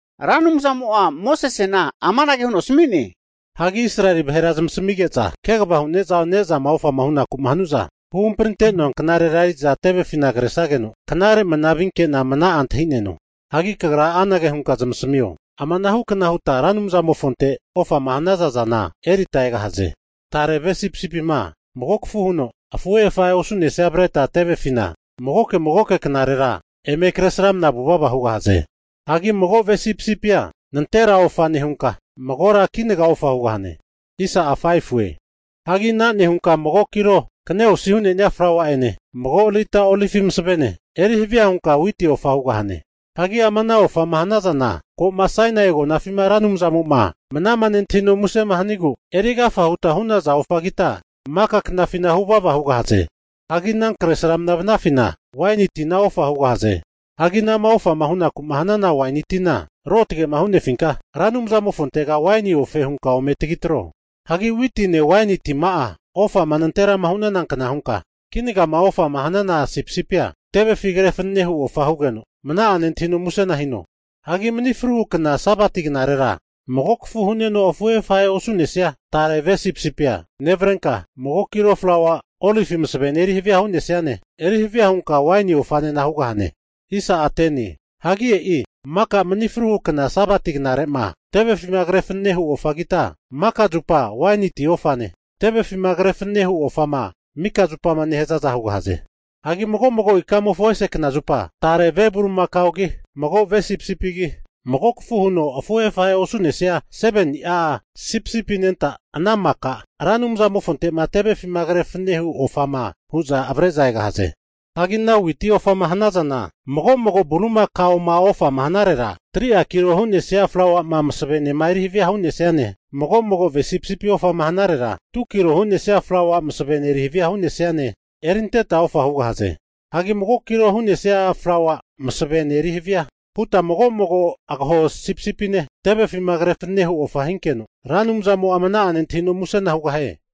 Ra Anumzamo'a Mosesena amanage huno asmi'ne, Israeli vahera zmasamige'za kegava hu'ne'za ne'zama ofama hunaku'ma hanu'za huhamprinte'noa knarera eri'za tevefina kresageno, knare mana vinke'na mna'a antahi'neno. Hagi kagra anage hunka zamasamio, ama anahukna huta Ra Anumzamofontera ofama hanaza zana erita egahaze. Tare ve sipisipima mago kafu huno afuhe afahe osu'nesia avreta tevefina magoke magoke knarera eme kresramana vuvava hugahaze. Hagi mago ve sipisipia nantera ofa nehuta, magora kinaga ofa hugahaze. Hagi ana nehuta mago kilo kane osi hu'nesia flaua'ene mago lita olivi masavene erihavia huta witi ofa hugahaze. Hagi ama ana ofama hanazana ko'ma Sainai agonafima Ra Anumzamo'ma mnama nentahino musema hanigu eri agafa huta hu'naza ofagita, maka knafina huvava hugahaze. Hagi ana kresramnama vanafina, waini tina ofa hugahaze. Hagi anama ofa hunaku'ma hanaza waini tina ruotage'ma hu'nefinka Ra Anumzamofontega waini ofe huta ome tagitreho. Hagi witine waini tima'a ofama nanterama hu'nazankna huta kinagama ofa hanaza sipsipia tevefi kre fanene hu ofa hinkeno, Anumzamo'a mna'a nentahino musena hino. Hagi mani fruhu kna Sabati knarera mago kafu huno afuhe afahe osu'nesia tare ve sipisipia nevarenka, mago kilo flaua olivi masavene eri havia hu'nesiane, eri havia hunka waini ofanena hugahane. Hagi e'i mika mani fru Sabati knare'ma tevefima kre fanenema hu ofagita, maka zupa waini ti ofane, tevefima kre fanene hu ofama mika zupama nehazaza hugahaze. Hagi mago'mago ikamofo ese kna zupa tare ve bulimakaogi, mago ve sipisipigi, mago kafu hu'no afuhe afehe osu'nenia 7ni'a sipisipi anenta ana maka Ra Anumzamofonte'ma tevefima kre fanene hu ofama hu'za avre'za egahaze. Hagi ana witi ofama hanazana mago mago bulimakaoma ofama hanarera, 3'a kilo hu'nesia flauama masavenema eri havia hu'nesiane, mago mago ve sipisipi ofama hanarera 2kilo hu'nesia flaua masavene eri havia hu'nesiane, erinteta ofa hugahaze. Hagi mago kilo hu'nesia flaua masavene erihavia huta mago mago agaho sipisipine tevefima kre fanenehu ofa hinkeno, Ra Anumzamo'a mna'a nentahino musena hugahie.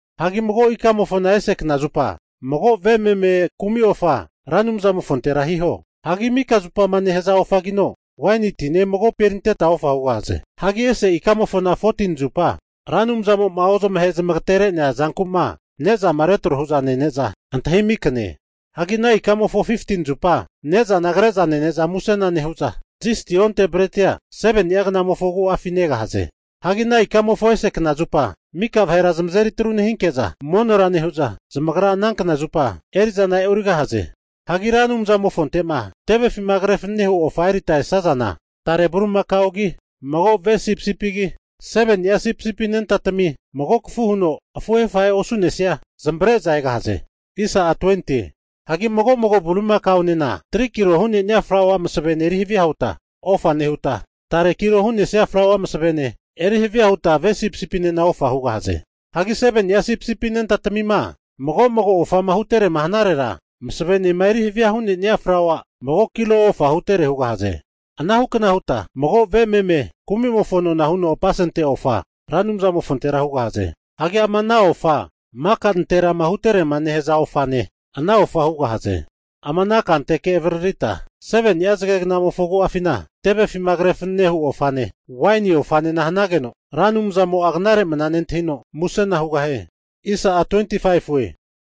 Hagi mago ikamofona ese kna zupa, mago ve meme kumi ofa Ra Anumzamofontera hiho. Hagi mika zupama nehaza ofagino waini tine magopi erinteta ofa hugahaze. Hagi ese ikamofona 14ni zupa Ra Anumzamo'ma ozamahe zamagatere'nea zanku'ma ne'zama retro hu'za nene'za antahimi kne. Hagi ana ikamofo 15zupa ne'zana kreza nene'za musena nehu'za, zisti onte bretia 7ni'a knamofo agu'afi negahaze. Hagi ana ikamofo ese knazupa, mika vahera zamazeri atru nehinke'za monora nehu'za, zamagra ana kna zupa eri'zana e'origahaze. Hagi Ra Anumzamofonte'ma tevefima kre fanenehu ofa erita esazana, tare bulimakaogi, mago ve sipisipigi, 7ni'a sipisipi anentatami mago kafu huno afuhe afahe osu'nesia zamavare'za egahaze. Hagi mago'mago bulimakaonena 3kilo hu'nenia flaua masavene eri havia huta ofa nehuta, tare kilo hu'nesia flaua masavene eri havia huta ve sipisipinena ofa hugahaze. Hagi 7ni'a sipisipi anentatamima mago magoma ofama huterema hanarera, masavenema erihavia hu'nenia flaua mago kilo ofa hutere hugahaze Anahukna huta mago ve meme kumimofo nona huno apasente ofa Ra Anumzamofontera hugahaze. Hagi ama ana ofa maka nanterama hutere'ma nehaza ofane, ana ofa hugahaze. Ama ana kanteke avaririta 7ni'a zagegnamofo agu'afina tevefima kre fanene hu ofane, waini ofanena hanageno Ra Anumzamo'a knare mana nentahino musena hugahie.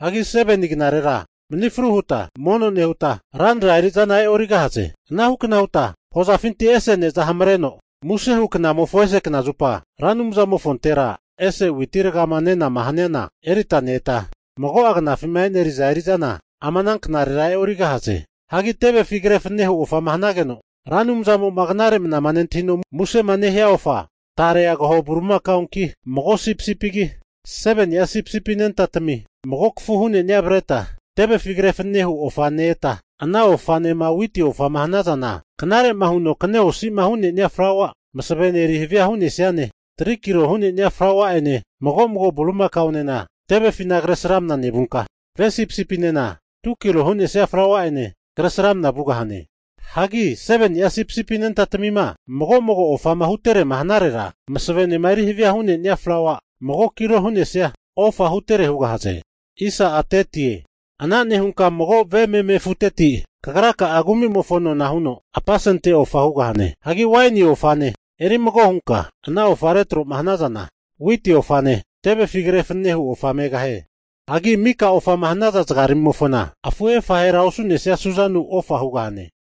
Hagi 7ni knarera mani fru huta mono nehuta, ranra eri'zana e'origahaze. Anahukna huta hozafinti ese ne'zama hamareno muse hu knamofona ese knazupa, Ra Anumzamofontera ese witi ragama nenama haniana erita ne-eta, mago'a knafima e'neri'za eri'zana ama ana knarera e'origahaze. Hianagi tevefi kre fanenehu ofama hanageno Ra Anumzamo'ma knare mana nentahino musema nehia ofa, tare agaho bulimakaonki, mago sipisipigi, 7ni'a sipisipi anentatami mago kafu hunenia avreta tevefi kre fanenehu ofa ne-eta, ana ofanema witi ofa hanazana, knare huno'ma kane osi'ma hu'nenia flaua masavene eri havia hu'nesiana, 3'a kilo hu'nenia flaua'ene mago mago bulimakonena tevefina kresramna nevunka, ve sipisipinena 2kilo hu'nesia flaua'ene kresramana vugahane. Hagi 7ni'a sipisipi anentatamima mago mago'ma ofama hutere'ma hanarera, masavenema erihavia hu'nenia flaua mago kilo hu'nesia ofa hutere hugahaze Ana nehunka mago ve meme afuteti kagra'a kumimofo nona huno apasente ofa hugahane. Hagi waini ofane eri mago hunka ana ofa retroma hanazana, witi ofane tevefi kre fanene hu ofa megahie. Hagi mika ofama hanaza zagaramimofona afuhe afahera osu'nesia su'zanu ofa hugahane.